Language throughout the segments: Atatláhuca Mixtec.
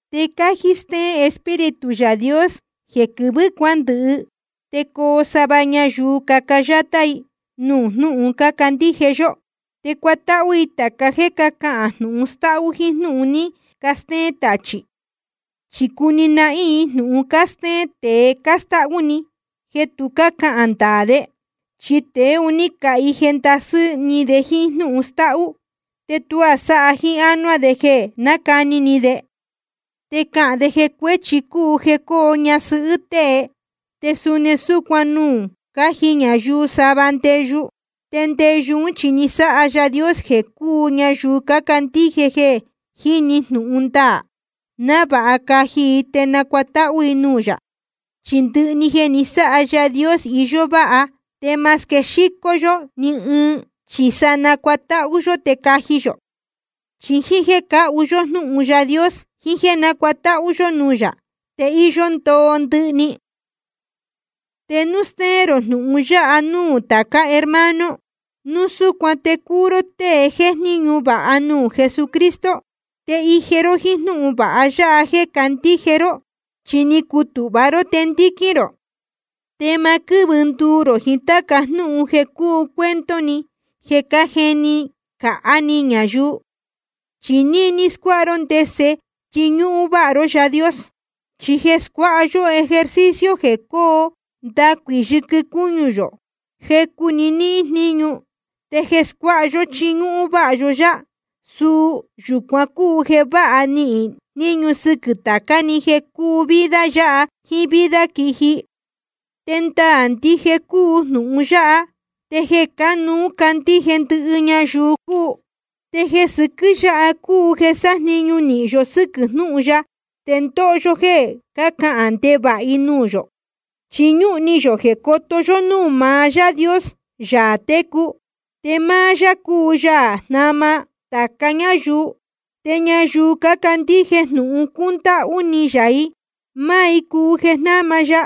Te cájí stéén Espíritu Yaā Dios jeē quɨvɨ̄ cuándɨhɨ te coo sava ñayuu caca yátá i nuū jnúhun cácandíje yó. Te cuatáhú i tāca jéē cácahān jnūhun stáhú jíín jnúhun ní castéén tachī. Chi cuni nahín i jnūhun cástéén tēe cástáhú‑ni, jeē tu cácahān ndaā de. Chi tēe un ní cahije ndasɨ́ ni de jíín jnúhun stáhú, te tuá sáha jíín ánuá de jeē nácani ni de. Te cahān de jeē cuēchi cúu jeē coo ñasɨhɨ́ tée, te suni súcuan núu caji ñayuu sava ndeyu. Te ndeyu ún chi ni sáha Yaā Dios jeē cúu ñayuu cácandíje jeē jiní jnūhun ndaā, návāha caji i te nacuatáhú i nuū yā. Chi ndɨhɨ jeē ni sáha Yaā Dios, íyó váha, te ma squexícó yō ni ɨɨn, chi sa nacuatáhú yó te caji yō. Chi jíín jéē cáhu yó jnúhun Yaā Dios jiín jéē nácuatáhú yó nuū yā, te íyó ndoo ndɨhɨ‑ni. Te núu stéén rō jnūhun yáha núū tācá hermano, núu súcuan te cuu ró tée jéjníñu vāha nuū Jesucristo, te ije ró jíín jnúhun vāha ya jeē candíje ró, chi ni cutūhva ró te ndíquín rō. Te ma quɨ́vɨ nduu rō jiín táca jnúhun jeē cúu cuento‑ni jeē cájeni cāhá ni ñayuu. Chi níní na scuáha ró ndese chiñúhún váha ró Yaā Dios. Chi jeē scuáha yó ejercicio jeē cóo ndacuī yɨquɨ cúñu yō, jecu‑ni níhín jníñu. Te jeē scuáha yó chiñúhún váha yó yá, suu yūcuan cúu jeē váha níhín jníñu sɨquɨ̄ tācá‑ni, jeē cúu vida yáha jíín vida quiji. Te ndaā ndije cúu jnūhun yáha, te jeē cánuú candíje ndɨhɨ ñayuu cúu. Te jeē sɨquɨ́ yáha cúu jeē sájniñu nīhin yó sɨ́quɨ̄ jnúhun ya te ndóho yó jéē cácahān ndevāha i nuū yō. Chi ñúhún ni yō jeē coto yó núū maá Yaā Dios, Yaā técu. Te máá yá cúu Yaā jnáma tāca ñáyuu, te ñayuu cácandíje jnūhun cúndáhú ni yā i, máá i cúu jeē jnáma ya.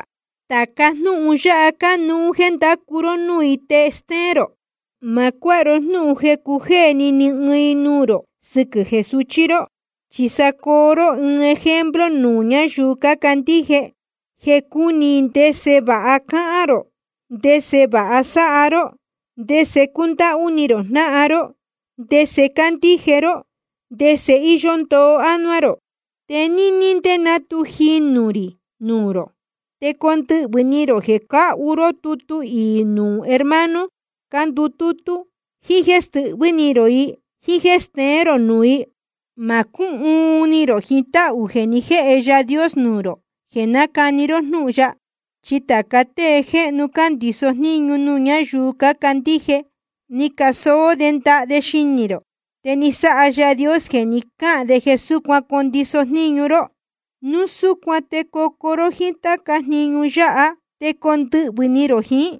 Tāca jnúhun yáha cánuú jéē ndacu ró núū i te stéén rō. Ma cuáha ro jnúhun jeē cujéē ni ni ɨɨn i nuū rō sɨquɨ̄ jeē suchí ró. Chi sa coo ró ɨɨn ejemplo nuū ñáyuu cácandíje, jeē cúni i ndese vāha cáhán rō, ndese vāha sáha ró, ndese cúndáhú ni rō jnáhan ró, ndese cándíje ró, ndese íyó ndoo ánuá rō. Te níní ndé ná tu jinū rī nuū rō, te condɨhvɨ̄ ni rō jeē cáhu ró tutu iī nuū hermano cándutútú, jíín jéē stɨhvɨ́ ni rō i, jíín jéē steén rō nuū i. Ma cúhuun ni rō jiín táhū jeē ni jéhe Yaā Dios nuū rō jeē nácani ró jnúhun ya. Chi tāca tée jéhnu cándiso jníñu nuū ñáyuu cácandíje, ni casóó de ndaha de xinī rō, te ni sáha Yaā Dios jeē ní cacahān de jeē súcuan condiso jníñu ró. Núu súcuan te cocuu ró jíín táca jniñu yáha, te condɨhvɨ̄ ni rō jiín,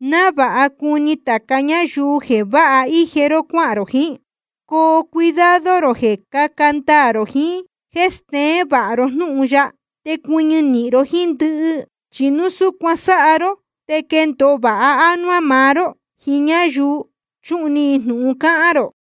návāha cuni tāca ñáyuu jeē váha íje ró cuáhān rō jiín. Coo cuidado rō jeē caca ndaā rō jiín jéē steén vāha ró jnúhun ya, te cuɨñɨ nīhin ró jíín ndɨhɨ. Chi núu súcuan sáha ró te quendōo vāha ánuá maá ró jiín ñáyuu chuhun ni jnūhun cáhán rō.